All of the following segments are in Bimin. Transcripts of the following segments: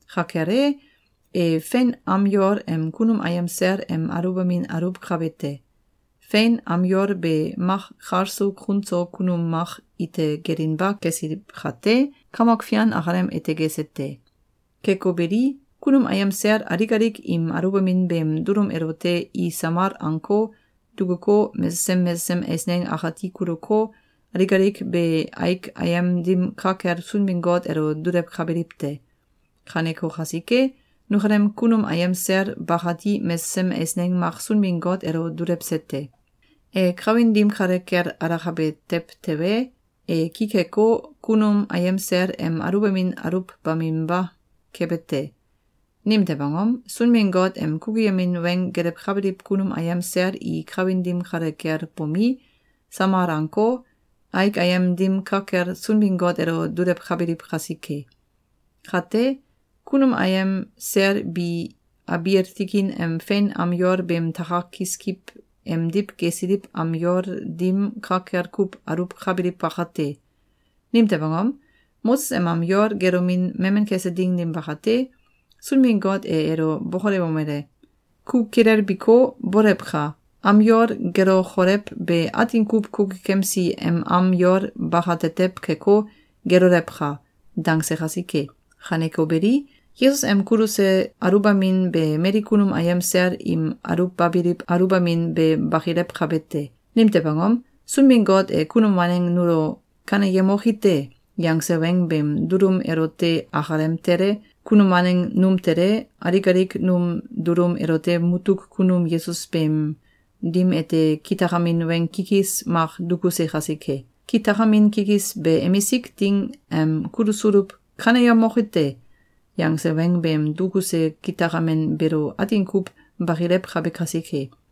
Ka kel e, e fein am yol em kunum ayem sel em aluwbamin aluwkabe te. Fein am yol be mak kal so kun so kunum mak ite gelinba kesiliw kate, Kamok Fian akalem ete gese te. Keko beli, kunum ayem sel alik alik im aluwbamin beem dulum elote i samal anko, dukuko, mesesem mesesem eisneng akati kuluko, alik alik be aik ayem dim ka kel Sunbin-Got elo dulewkabiliw te. Kaneko kasike, nukalem kunum ayem sel bakati mesesem eisneng mak Sunbin-Got elo dulewse te. E kawin dim kale kel alakabe tew tewe, e ki keko, kunum ayem sel em aluwbamin aluwbaminba kebe te. Nimtew angom? Sunbin-Got em kukuyemin weng gelewkabiliw kunum ayem sel i kawin dim kale kel bomi, samal anko, aik ayem dim ka kel Sunbin-Got elo dulewkabiliw kasike. Kate, kunum ayem sel bi abiil tikin em fein am yol beem takak kiskiw emdiw gesiliw am yol dim ka kel kuw aluwkabiliw bakate. Nimtew angom? Moses em am yol gelomin memen kese ding dim bakate, Sunbin-Got e elo bokolewomele: “Ku kilelbiko, bolewka! Am yol gelokolew be atin kuw kukukemsi em am yol bakatetew keko, gelolewka!”, dangse kasike. Kaneko beli, Yesus em kuluse aluwbamin be mali kunum ayem sel im aluwbabiliw aluwbamin be bakilewkabe te. Nimtew angom? Sunbin-Got e kunum waneng nulo “Kaneyemoki te!”, yangse weng beem dulum elote akalem tele, kunum waneng num tele, alik alik num dulum elote mutuk kunum Yesus beem dim ete kitakamin weng kikis mak dukuse kasike. Kitakamin kikis be emisik ding em kulusuluw “Kaneyemoki te!”, yangse weng beem dukuse kitakamin beelo atin kuw bakilewkabe kasike.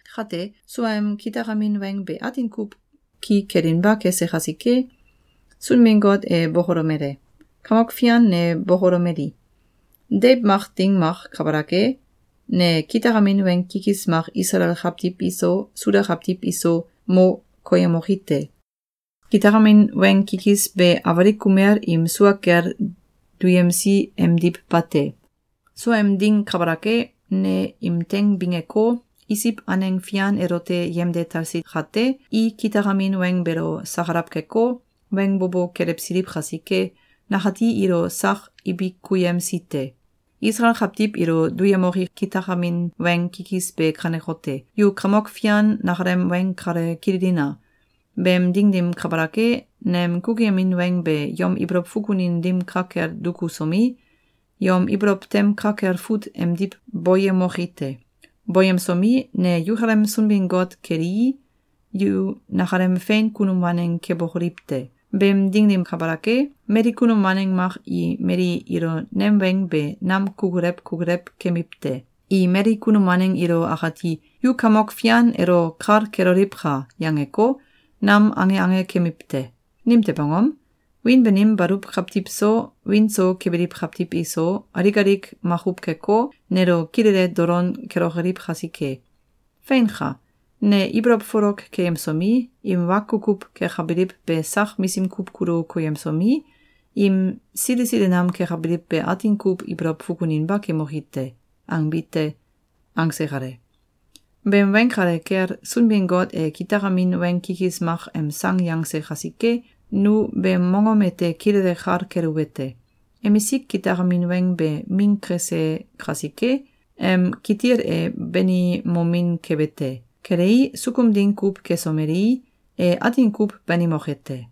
Kate, suaem kitakamin weng be atin kuw ki kelinba kese kasike, Sunbin-Got e bokolomele: “Kamok Fian ne bokolomeli: ‘Deiw mak ding mak kabalak e, Ne kitakamin weng kikis mak Isalael kawtiw iso, Suda kawtiw iso, mo koyemoki te. Kitakamin weng kikis be awalik kumel im sua kel duyemsi emdiw bate. Suaem ding kabalak e, ne im teing bingeko, Isiw aneng fian elote yemde talsi kate, i kitakamin weng beelo sakalaw keko, weng bo bo kelewsiliw kasike, nakati ilo sak ibikuyemsi te. Isalael kawtiw ilo duyemoki kitakamin weng kikis be kanekote: Yu Kamok Fian nakalem weng kale kililina! Beem ding dim kabalak e, nem kukuyemin weng be yom ibolow fukunin dim ka kel dukusomi, yom ibolow tem ka kel fut emdiw boyemoki te. Boyemsomi, ne yukalem Sunbin-Got kelii, yu nakalem fein kunum waneng kebokoliw te. Beem ding dim kabalak e, mali kunum waneng mak i mali ilo nem weng be nam kukulew kukulew kemiw te. I mali kunum waneng ilo akati ‘Yu Kamok Fian elo kal keloliwka!’, yangeko, nam ange ange kemiw te. Nimtew angom? Wiin banim baluw kawtiw so, wiin so kebiliw kawtiw iso, alik alik makuw keko, nelo kilele dolon kelokoliw kasike. Feinka! Ne ibolow folok keyemsomi, im wa kukuw kekabiliw be sak misim kuw kulu koyemsomi, im sili sili nam kekabiliw be atin kuw ibolow fukuninba kemoki te.’, angbi te.”, angse kale. Beem weng kale kel Sunbin-Got e kitakamin weng kikis mak em sang yangse kasike, nu beem mongom ete kilele kal keluwete: Emisik kitakamin weng be ming kese kasike, em kitil e banimomin kebe te. Kelei, sukum ding kuw kesomelei, e atin kuw banimoke te.